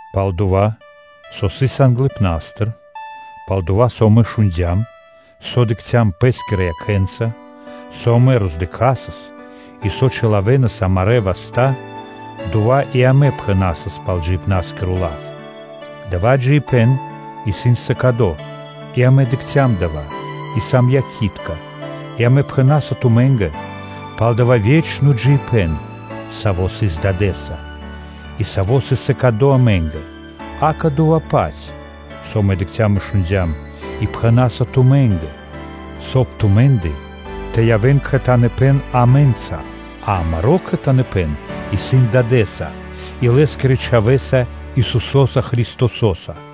Пал дова́, со сыс англыпна́стыр, пал дова́, со амэ шундя́м, со дыкхцям пэ́скирэ якхэ́нца, со амэ роздыкхасас, и со чилавэнас амарэ́ васта́, дова́ и амэ пхэнасас пал Джиибна́скиро лав, – дава́ джиибэ́н сыс сыкадо, и амэ дыкхцям дава́ и амэ сам якхи́тка и амэ пхэна́са тумэ́нгэ пал дава́ ве́чно джиибэ́н, саво́ сыс Дадэ́са, и саво́ сыс сыкадо амэ́нгэ, акэ, дова́-паць, со амэ дыкхцям и шундя́м, и пхэна́са тумэ́нгэ, соб (кай) тумэ́ндэ тэ явэ́н кхэтаныпэн амэ́нца, а амаро́ кхэтаныпэн исын Дадэ́са, и Лэ́скирэ чхавэ́са, Исусо́са Христосо́са.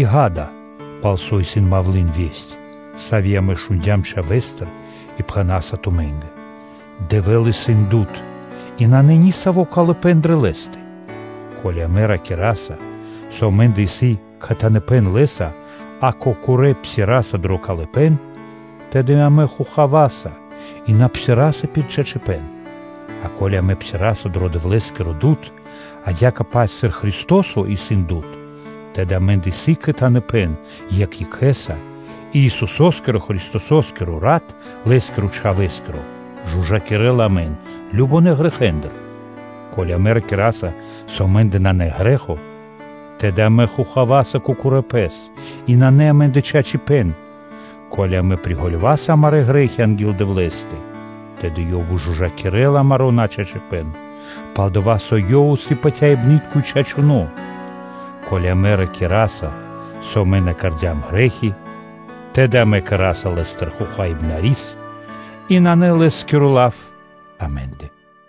И, ґа́да, пал со исын мавлы́н (малва), сави́ амэ шундя́м Чхавэстыр и пхэна́са тумэ́нгэ: Дэвэ́л исын дуд (свэ́то) и нанэ нисаво́ калыпэ́н дрэ Лэ́стэ. Ко́ли амэ ракираса, со амэ́ндэ исын кхэтаныпэн Лэ́са, а кокорэ́ псираса дро калыпэ́н, тэды амэ хохаваса и на псираса пир чачипэ́н. А ко́ли амэ псираса дро Дэвлэ́скиро дуд, адя́кэ-паць сыр Христо́со исын дуд, тэды амэ́ндэ исын кхэтаныпэн екх екхэ́са, и Исусо́скиро Христосо́скиро рат, Лэ́скирэ чхавэ́скиро, жужакирэла (чыстинэла) амэн кажнонэ́ грэхэ́ндыр. Ко́ли амэ ракираса, со амэ́ндэ нанэ грэ́хо, тэды амэ хохаваса кокорэ́ пэс, и нанэ амэ́ндэ чачипэ́н. Ко́ли амэ приґалёваса амарэ́ грэ́хи анги́л Дэвлэ́стэ, тэды Ёв выжужакирэ́ла амаро́ начачипэ́н, пал-дова́ со Ёв исын патяибны́тко, и чачуно́. Ко́ли амэ ракираса, со амэ на кэрдя́м грэ́хи, тэды амэ кэра́са Лэ́стыр Хохаибнарис, и нанэ Лэ́скиро лав амэ́ндэ.